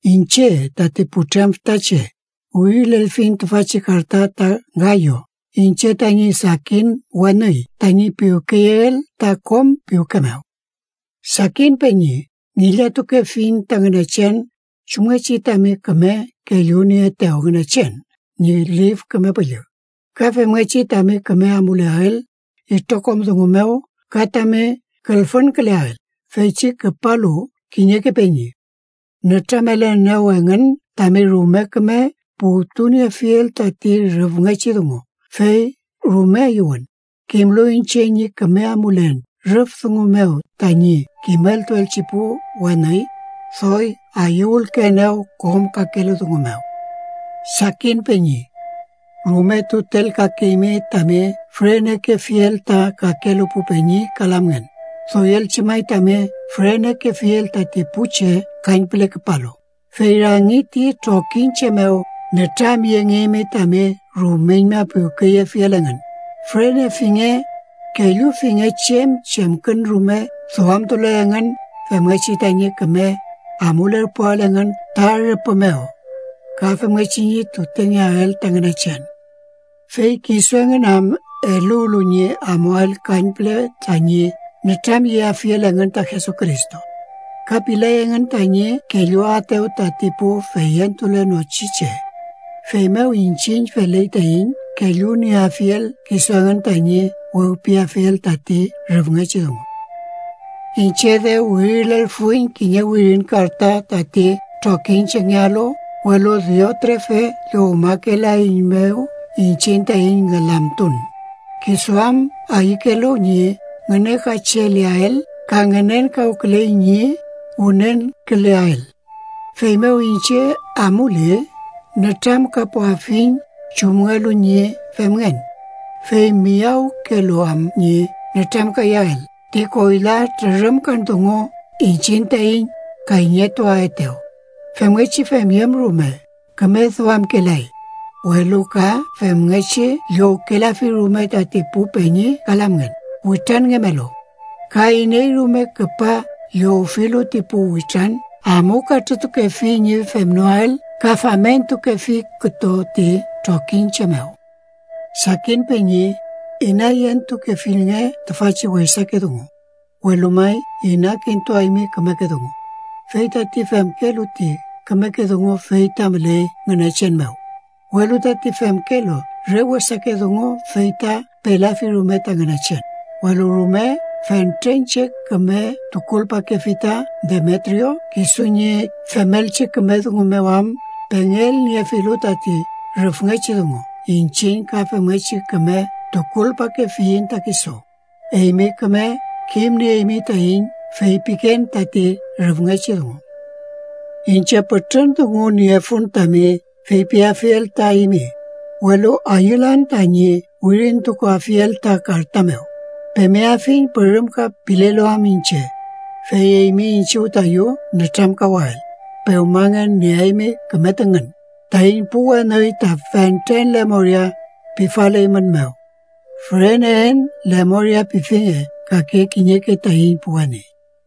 Iñche, tati putrem fütache, wirilelfiñ tüfachi karta ta Gayo, iñche tañi sakin weni, tañi piwkeyeel ta kom piwke mew. Sakin peñi, ngillatukefiñ ta Ngünechen chumngechi tami küme kellunieetew Ngünechen ñi Lif Küme Püllü, ka femngechi tami küme amuleael itrokom dungu mew ka tami külfünküleael. Feychi küpalu kiñeke peñi, nütramelenew engün tami rume küme puwtuniefiel tati rüfngechi dungu, fey rume ayüwün. Kimlu iñche ñi küme amulen rüf dungu mew tañi kimeltuelchi pu weni, doy ayüwülkeenew kom kakelu dungu mew. Sakin peñi, rume tutelkakeymi tami fürenekefiel ta kakelu pu peñi ka lamngen, doyelchi may tami fürenekefiel tati pu che kañpüle küpalu. Fey rangi ti trokiñche mew nütramyengeymi tami rumeñma piwkeyefiel engün. Fürenefinge. Kellufinge chem chemkün rume duamtule engün femngechi tañi küme amulerpuael engün ta rüpü mew, ka femngechi ñi tutengeael ta Ngünechen. Fey kisu engün am eluwlu ñi amuael kañpüle tañi nütramyeafiel engün ta Jesucristo, ka pilay engün tañi kelluaetew tati pu feyentulenochi che. Feymew iñchiñ feley taiñ kellunieafiel kisu engün tañi wewpiafiel tati rüfngechi dungu. Iñche dew wirilelfuiñ kiñe wirin karta tati trokiñchengealu, welu Diotrefe llowmakelaeiñmew iñchiñ taiñ ngülamtun, kisu am ayükelu ñi ngünekacheleael ka ngenkawküley ñi wünenküleael. Feymew iñche amuli, nütramkapuafiñ chumngelu ñi femngen, fey miyawkelu am ñi nütramkayael ti koyla trürümkan dungu iñchiñ taiñ kayñetuaetew. Femngechi femyüm rume, küme duamkelay, welu ka femngechi llowkelafi rume tati pu peñi ka lamngen witranngemelu, ka iney rume küpa llowfilu ti pu witran amukatrütukefi ñi femnoael ka famentukefi kütu ti trokiñche mew. Sakin peñi, inayentukefilnge tüfachi wesake dungu, welu may inakintuaymi kümeke dungu. Fey tati femkelu ti kümeke dungu fey ta müley Ngünechen mew, welu tati femkelu re wesake dungu fey ta pelafi rume ta Ngünechen. Welu rume fentren che küme tukulpakefi ta Demetrio kisu ñi femelchi küme dungu mew am pengelniefilu tati rüfngechi dungu. Iñchiñ ka femngechi küme tukulpakefiyiñ ta kisu. Eymi küme kimnieymi taiñ feypiken tati rüfngechi dungu. Iñche pütrün dungu niefun tami feypiafiel ta eymi, welu ayülan tañi wirintukuafiel ta karta mew. Pemeafiñ pürümka pilelu am iñche, fey eymi iñchiw tayu nütramkawael. Pewmangen nieaymi küme tüngün. Taiñ pu weni ta fentren lemoria pifaleymünmew. Füreneen lemoria pifinge kake kiñeke taiñ pu weni.